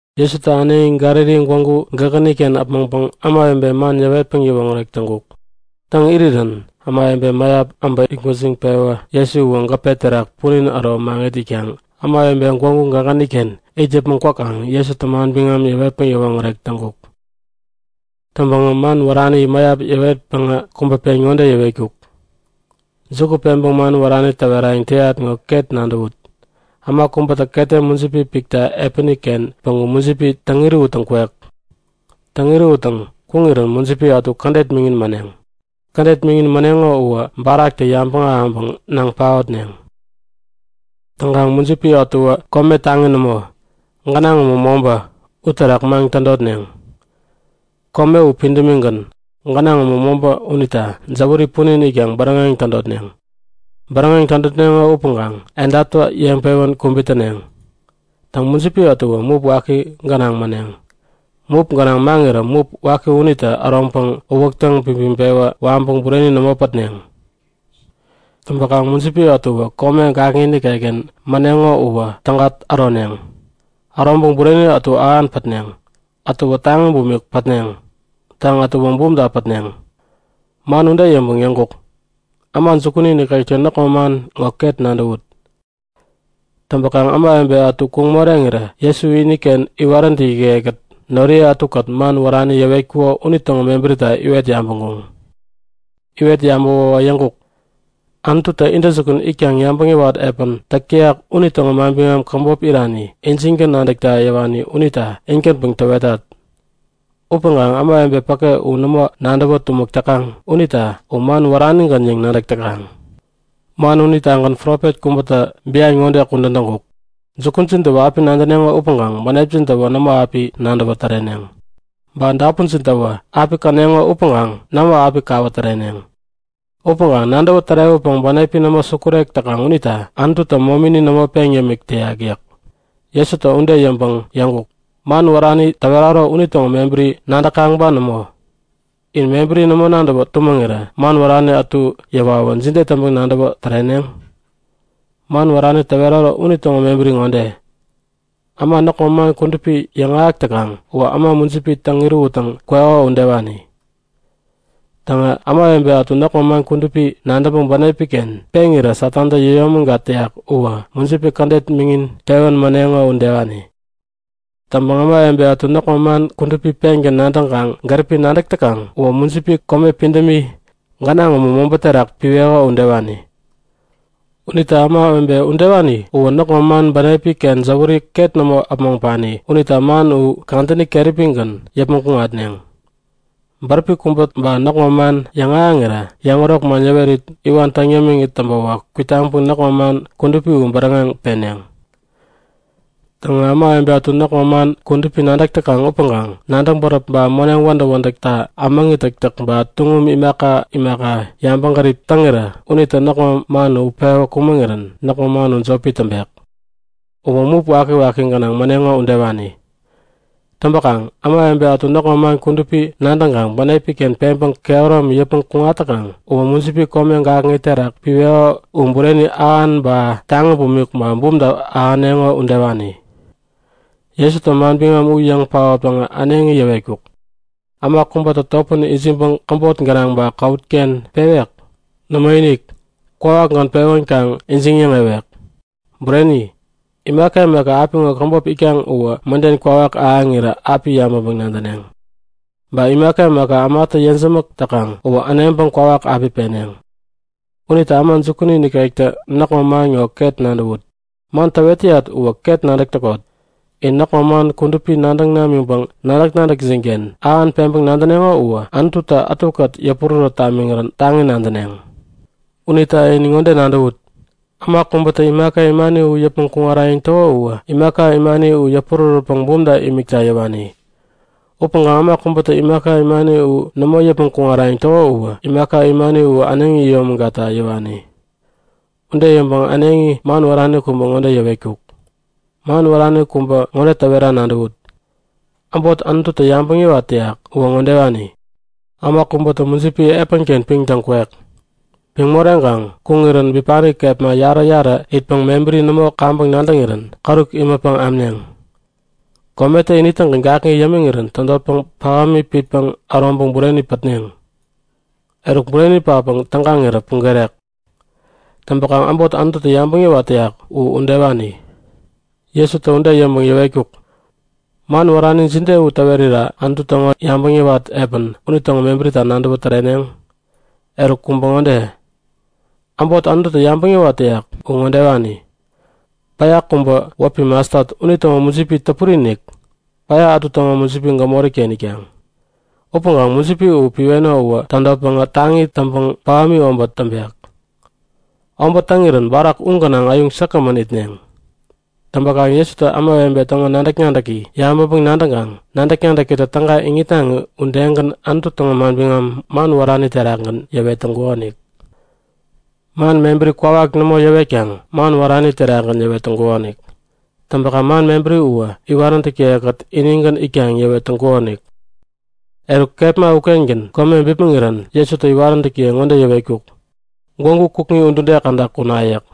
Jesutä äneŋi Galili gwägu gägäni-ken äpmoŋpäŋ ämawebe man yäwetpäŋ yäwoŋärek täŋkuk. Täŋ irirän ämawebe mäyap äbä itgwäjiŋpewä Jesu uwä gäpe terak punin äro maŋit itkaŋ ämawebe gwägu gägäni-ken it yäpmäŋ kwäkaŋ Jesutä manbiŋam yäwetpäŋ yäwoŋärek täŋkuk. Täŋpäŋä man wärani mäyap yäwetpäŋä kubä pen ŋode yäwetkuk; Juku peŋpäŋ man wärani täwerayäŋ täyat ŋo ket nadäwut! Äma kubätä ketem mujipi pikta epäni-ken päŋku mujipi täŋ-irähuttäŋ kwek. Täŋ-irähuttäŋ kuŋirän mujipi ätu kädet miŋin mäneŋ. Kädet miŋin mäneŋo uwä baraktä yabäŋ ahäŋpäŋ naŋ paotneŋ. Täŋkaŋ mujipi ätuwä kome taŋi nämo, gänaŋ umu mobä, uterak maŋ tädotneŋ. Kome u pidämigän, gänaŋ umu mobä unita jäwäri punin itkaŋ bäräŋeŋ tädotneŋ. Bäräŋeŋ tädotneŋo upäŋkaŋ edaptä yeŋpewän kubit täneŋ. Täŋ, mujipi ätuwä mup waki gänaŋ mäneŋ. Mup gänaŋ maŋirä mup waki unitä äroŋpäŋ uwäk täŋpipiŋ-pewä waŋpäŋ bureni nämo pätneŋ. Täŋpäkaŋ mujipi ätuwä kome gakŋi nikekken mäneŋo uwä täga äroneŋ. Äroŋpäŋ bureni ätu ähan pätneŋ. Ätuwä taŋi bumik pätneŋ. Täŋ, ätuwä bumta pätneŋ. Man ude yäŋpäŋ yäŋkuk; Äma jukuni nikektä näkŋo man ŋo ket nadäwut! Täŋpäkaŋ ämawebe ätu kuŋ moreŋirä Jesu iniken iwaräntäkiye-kät noriye ätukät man wärani yäwetkuko unitäŋo mebärita iwet yabäŋkuŋ. Iwet yabäwäwä yäŋkuk; Anututä intäjukun itkaŋ yabäŋ yäwat epän täk täyak unitäŋo manbiŋam käbop irani injingän nadäkta yäwani unita in-gänpäŋ täwetat. Upäŋkaŋ ämawebe päke u nämo nadäwä tumäk täkaŋ unita u man wäranigän yäŋ nadäk täkaŋ. Man unitagän profet kubätä bian ŋode kudän täŋkuk; Jukujin täwä api nadäneŋo upäŋkaŋ bänepjintä nämo api nadäwä täreneŋ. Ba dapunjintäwä api käneŋo upäŋkaŋ nämo api kawä täreneŋ. Upäŋkaŋ nadäwä tärewäpäŋ bänepi nämo sukurek täkaŋ unita Anututä momini nämo peŋ yämik täyak yäk. Jesutä ude yäŋpäŋ yäŋkuk; Man wärani täweraro unitäŋo mebäri nadäkaŋ ba nämo? In mebäri nämo nadäwä tumäŋirä man wärani ätu yäwawä jide täŋpäŋ nadäwä täreneŋ? Man wärani täweraro unitäŋo mebäri ŋode; Äma näkŋo man kudupi yäŋahäk täkaŋ uwä äma mujipi täŋ-irähuttäŋ kweko udewani. Täŋä ämawebe ätu näkŋo man kudupi nadäŋpäŋ bänepi-ken peŋirä Satantä yäyomägat täyak uwä mujipi kädet miŋin pewän mäneŋo udewani. Täŋpäŋ ämawebe ätu näkŋo man kudupi pengän nadäŋkaŋ gäripi nadäk täkaŋ uwä mujipi kome pidämi, gänaŋ umu mobä uterak piweko udewani. Unita ämawebe udewani uwä näkŋo man bänepi-ken jäwäri ket nämo äpmoŋpani unita man u kadäni keräpigän yäpmäŋ kuŋatneŋ. Bäräpi kubä ba näkŋo man yäŋahäŋirä yäŋärok man yäwerit iwan täŋ yämiŋit täŋpäwä kwitaŋpäŋ näkŋo man kudupi u bäräŋeŋ peneŋ. Täŋä ämawebe ätu näkŋo man kudupi nadäk täkaŋ upäŋkaŋ nadäŋ bäräp ba moneŋ wädäk-wädäkta ämäŋi täktäk ba tuŋum imaka imakata yabäŋgärip täŋirä unitä näkŋo man utpewä kumäŋirän näkŋo man jopi täŋpek. Uwä mup wakiwaki gänaŋ mäneŋo udewani. Täŋpäkaŋ ämawebe ätu näkŋo man kudupi nadäŋkaŋ bänepi-ken peŋpäŋ kehäromi yäpmäŋ kuŋat täkaŋ uwä mujipi kome gakŋi terak piweko u bureni ähan ba taŋi bumik ba bumta ahäneŋo udewani. Jesutä manbiŋam u yäŋ paotpäŋä äneŋi yäwetkuk; Äma kubätä topän ijiŋpäŋ käbot gänaŋ ba käwut-ken pewek? Nämoinik! Kwawakgän pewänkaŋ ijiŋ-yäŋewek. Bureni! Imaka imaka apiŋo käbop itkaŋ uwä mäden kwawak ahäŋirä api yabäŋpäŋ-nadäneŋ. Ba imaka imaka ämatä yejämäk täkaŋ uwä äneŋpäŋ kwawak api peneŋ. Unita äma jukuni nikektä näkŋo man ŋo ket nadäwut! Man täwet täyat uwä ket nadäk täkot. In näkŋo man kudupi nadäŋ namiŋpäŋ nadäk-nadäkjin-ken ähan peŋpäŋ nadäneŋo uwä Anututä ätukät yäpurärät tamiŋirän taŋi nadäneŋ. Unita in ŋode nadäwut; Äma kubätä imaka imani u yäpmäŋ kuŋarayäŋ täko uwä imaka imani uwä yäpurärätpäŋ bumta imikta yäwani. Upäŋkaŋ äma kubätä imaka imani u nämo yäpmäŋ kuŋarayäŋ täko uwä imaka imani u äneŋi yomägatta yäwani. Ude yäŋpäŋ äneŋi man wärani kubä ŋode yäwetkuk; Man wärani kubä ŋode täwera nadäwut; Äbot Anututä yabäŋ yäwat täyak uwä ŋodewani; Äma kubätä mujipi epäni-ken piŋtäŋ kwek. Piŋ moreŋkaŋ kuŋirän bipani kepma yarä-yarä itpäŋ mebäri nämo kaŋpäŋ nadäŋirän käruk imätpäŋ amneŋ. Kometä ini-tägän gakŋi yämiŋirän tädotpäŋ pähämi pitpäŋ äroŋpäŋ bureni pätneŋ. Eruk bureni patpäŋ tägaŋirä pugerek. Täŋpäkaŋ äbot Anututä yabäŋ yäwat täyak u udewani. Jesutä ude yäŋpäŋ yäwetkuk; Man wärani jide u täwerira Anutu täŋo yabäŋ yäwat epän unitäŋo mebärita nadäwä täreneŋ? Eruk, kubä ŋode; Äbot Anututä yabäŋ yäwat täyak u ŋodewani; Päya kubä wäpi mastat unitäŋo mujipi täpuri-inik, päya ätu täŋo mujipi gämori-ken itkaŋ. Upäŋkaŋ mujipi u piweno uwä tädotpäŋä taŋi täŋpäŋ pähämi obät täŋpek. Obät täŋirän barak u gänaŋ äyuŋ säkgämän itneŋ. Täŋpäkaŋ Jesutä ämawebe täŋo nadäk-nadäki yabäŋpäŋ-nadäŋkaŋ nadäk-nadäkitä täga iŋitnaŋi udegän Anutu täŋo manbiŋam man wärani terakgän yäwet täŋkukonik. Man mebäri kwawak nämo yäwetkaŋ man wärani terakgän yäwet täŋkukonik. Täŋpäkaŋ man mebäri uwä iwaräntäkiye-kät inigän itkaŋ yäwet täŋkukonik. Eruk kepma ukengän kome bipmäŋirän Jesutä iwaräntäkiye ŋode yäwetkuk; Gwägu kukŋi udude käda kuna yäk.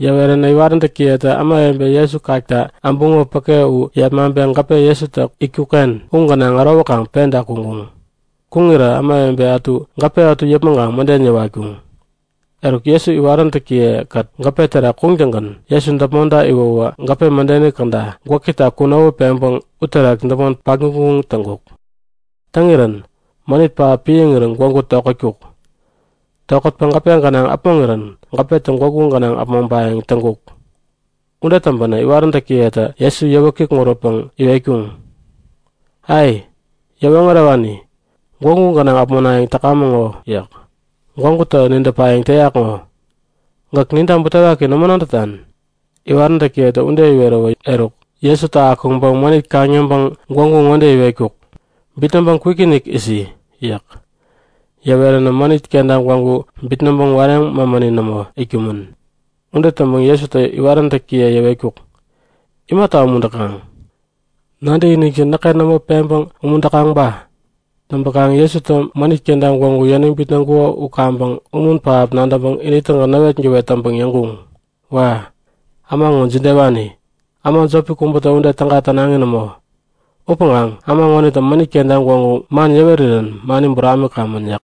Yäweränä iwaräntäkiyetä ämawebe Jesu kakta äbuŋo päke u yepmaŋpeŋ gäpe Jesutä itkuk-ken u gänaŋ ärowäkaŋ penta kuŋkuŋ. Kuŋirä ämawebe ätu gäpe ätu yäpmäŋkaŋ mäden yäwatkuŋ. Eruk, Jesu iwaräntäkiye-kät gäpe terak kuŋtäŋgän Jesu däpmonta iwäwä gäpe mädeni käda gwäkita kunowä peŋpäŋ uterak däpmon patguŋ-guŋ täŋkuk. Parirän mänit pähap piäŋirän gwägu tokätkuk. Tokätpäŋ gäpe gänaŋ äpmoŋirän gäpetä gwägu gänaŋ äpmoŋpayäŋ täŋkuk. Ude täŋpänä iwaräntäkiyetä Jesu yäwä kikŋuränpäŋ iwetkuŋ; Ai! Yäwoŋärewani, gwägu gänaŋ äpmonayäŋ täkamäŋ ŋo yäk. Gwägutä nidäpayäŋ täyak ŋo. Gäk ninta butewaki nämo nadätan? Iwaräntäkiyetä ude iweräwä eruk, Jesutä akuŋpäŋ mänit kaŋ-yäŋpäŋ gwägu ŋode iwetkuk; Bitnäŋpäŋ kwikinik isi! yäk. Yäweränä mänit kenta gwägu bitnäŋpäŋ wareŋ mämäni nämo itkumän. Ude täŋpäŋ Jesutä iwaräntäkiye yäwetkuk; Imata umuntäkaŋ? Nadäkinikjin näkken nämo peŋpäŋ umuntäkaŋ ba? Täŋpäkaŋ Jesutä mänit kenta gwägu yäniŋ bitnäŋkuko u kaŋpäŋ umun pähap nadäŋpäŋ ini-tägän näwetgäwet täŋpäŋ yäŋkuŋ; Wa! Äma ŋo jidewani! Äma jopi kubätä ude täga tänaŋi nämo. Upäŋkaŋ äma ŋonitä mänit kenta gwägu man yäwerirän mani buramikamän! yäk.